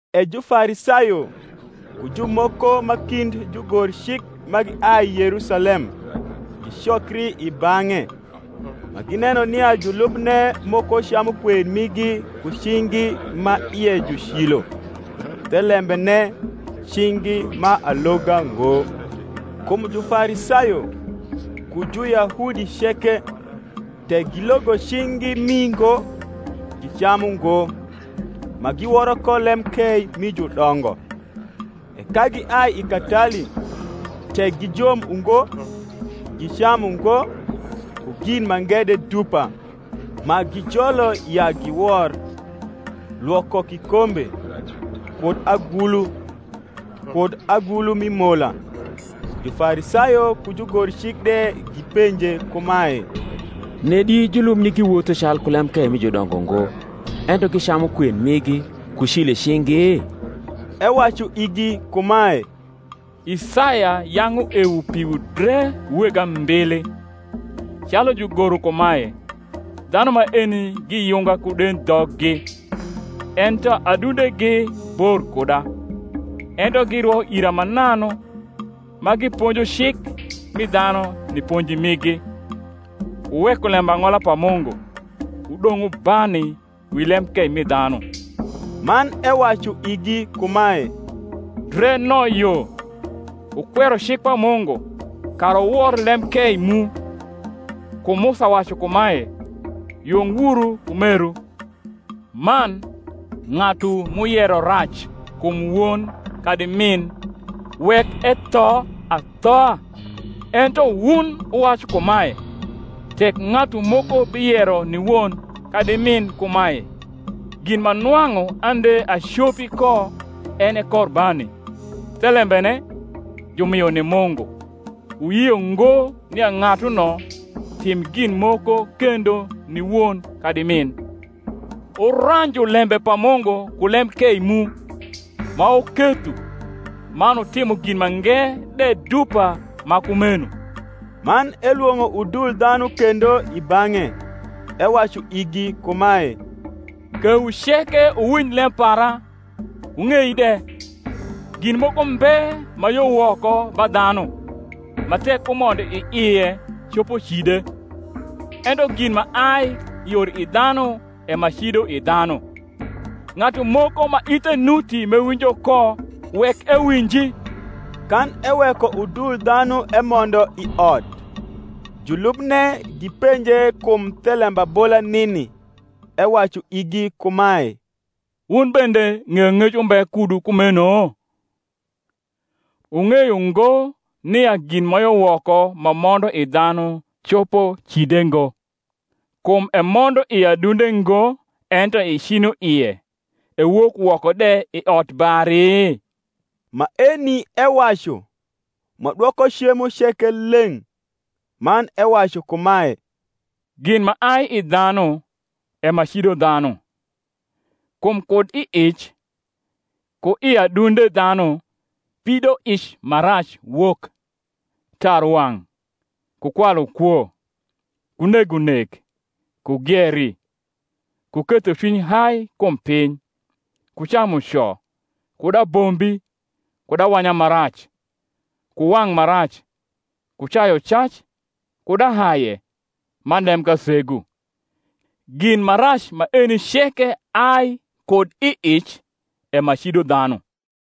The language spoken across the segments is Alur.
E Jufarisayo, ku jumoko ma kind jugorcik ma giai Yerusalem, gicokri i bang’e, ma gineno nia julubne moko camu kwen migi ku cing’gi ma ie ju cilo, thelembene, cing’gi ma aloga ngo. (Kum Jufarisayo, ku Juyahudi ceke, tek gilogo cing’gi mii ngo, gicamu ngo, ma giworo ko lemkei mi judongo: e ka giai i katali, tek gijom ungo, gicamu ngo; ku gin mange de dupa, ma gijolo ya giwor, lwoko kikombe, kud agulu, kud agulu mi mola.) Jufarisayo ku jugorcik de gipenje kumae, Nedi julubni giwotho calku lemkei mi judongo ngo, ento gicamu kwen migi ku cilo i cing’gi? Ewacu igi kumae, Isaya yang’ uewo piwu dre wu weg ambili, calu jugoro kumae, Dhanu maeni giyunga ku dendhoggi, Ento adundegi bor kuda. Ento girwo ira mananu, Ma giponjo cik mi dhanu ni ponji migi. Wuweko lembang’ola pa Mungu, wudong’ wubani wi lemkei mi dhanu. Man ewacu igi kumae, Dre no yo, wukwero cik pa Mungu, kara wuwor lemkei mu. Kum Musa wacu kumae, Yung wuru ku meru; man, ng’atu m’uyero rac kum won kadi min, wek etho athoa: ento wun wuwacu kumae, Tek ng’atu moko biyero ni won kadi min kumae, Gin ma nwang’u ande acopi ko en e Korbani, thelembene, jumio ni Mungu; wuyio ngo nia ng’atuno tim gin moko kendo ni won kadi min; wuranju lembe pa Mungu ku lemkei mu, ma wuketho: man wutimo gin mange de dupa ma kumeno. Man elwong’o udul dhanu kendo i bang’e, ewacu igi kumae, Kewu ceke wuwinj lem para, wung’ei de: gin moko mbe ma yo woko ba dhanu, ma tek umondo i ie copo cide; ento gin ma ai yor i dhanu e ma cido i dhanu. Ng’atu moko ma ithe nuti m’ewinjo ko, wek ewinji. Kan eweko udul dhanu emondo i ot, julubne gipenje kum the lembabola nini. Ewacu igi kumae, Wun bende ng’eyong’ec umbe kudu kumeno? Wung’eyo ngo, nia gin ma yo woko ma mondo i dhanu, copo cide ngo; kum emondo i adunde ngo ento i cinoie, ewok woko de i odbari? Maeni ewacu, ma dwoko cemo ceke leng’. Man ewacu kumae, Gin ma ai i dhanu, e ma cido dhanu. Kum kud i ic, ku i adunde dhanu, pidoic ma rac wok, tarwang’, ku kwalukwo, ku negonek, ku gieri, ku ketho cwiny hai kum piny, ku camuco, kud abombi, kud awanya ma rac, ku wang’ ma rac, ku cayucac, kud ahaye, man lemkasegu: gin ma rac maeni ceke ai kud i ic, e ma cido dhanu.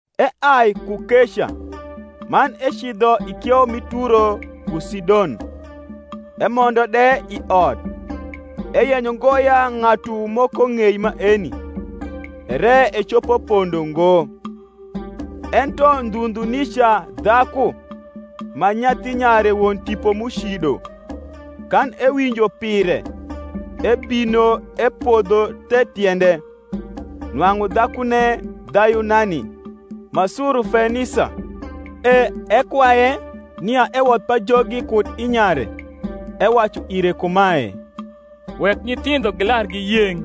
Eai ku keca, man ecidho i kieu mi Turo ku Sidon. Emondo de i ot, eyenyo ngo ya ng’atu moko ng’ei maeni; ere ecopo pondo ngo. Ento ndhu ndhu nica dhaku, ma nyathi nyare won tipo m’ucido, kan ewinjo pire, ebino epodho the tiende. Nwang’u dhakune Dhayunani, ma Surufenisa. E ekwaye nia ewodh pajogi kud i nyare. Ewacu ire kumae, Wek nyithindho gilar giyeng’: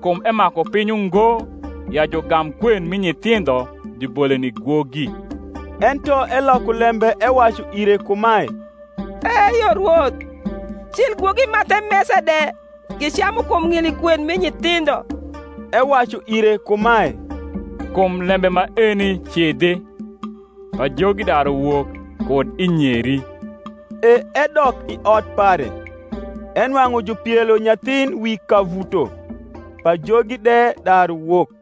kum emaku piny ungo ya jugam kwen mi nyithindho jubole ni gwogi. Ento eloko lembe ewacu ire kumae, Eyo, Rwoth; cil gwogi ma the mesa de gicamu kum ng’ili kwen mi nyithindho. Ewacu ire kumae, Kum lembe maeni cidhi; pajogi daru wok kud i nyeri. E edok i ot pare, enwang’u jupielo nyathin wi kavuto, pajogi de daru wok.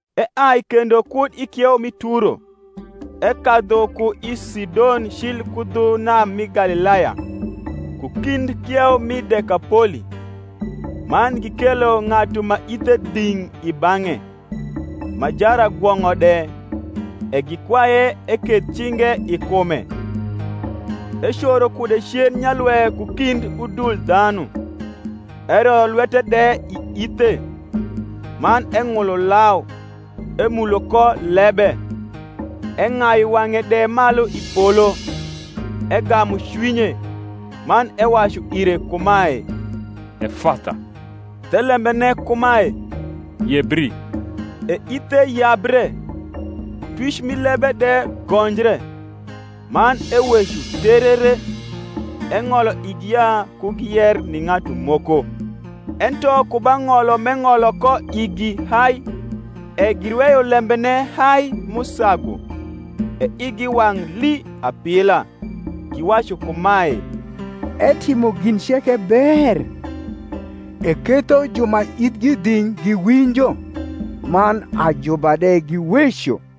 Eai kendo kud i kieu mi Turo, ekadhu ku i Sidon cil ku dhu nam mi Galilaya, ku kind kieu mi Dekapoli. Man gikelo ng’atu ma ithe dhing’ i bang’e, ma jaragwong’o de; e gikwaye eketh cinge i kume. Ecoro kude cen nyalwe ku kmd udul dhanu, eroyo lwete de i ithe, man eng’ulo lau, emulo ko lebe; eng’ayu wang’e de malu i polo, egamu cwinye, man ewacu ire kumae, Efatha, thelembene kumae, Yebri. E ithe yabre, twic mi lebe de gonjre, man eweco terere. Eng’olo igi ya ku giyer ni ng’atu moko: ento ku ba ng’olo m’eng’olo ko igi hai, e girweyo lembene hai m’usagu. E igi wang’ lii apila, giwacu kumae, Etimo gin ceke ber; eketho ju ma ithgi dhing’ giwinjo, man ajuba de giweco.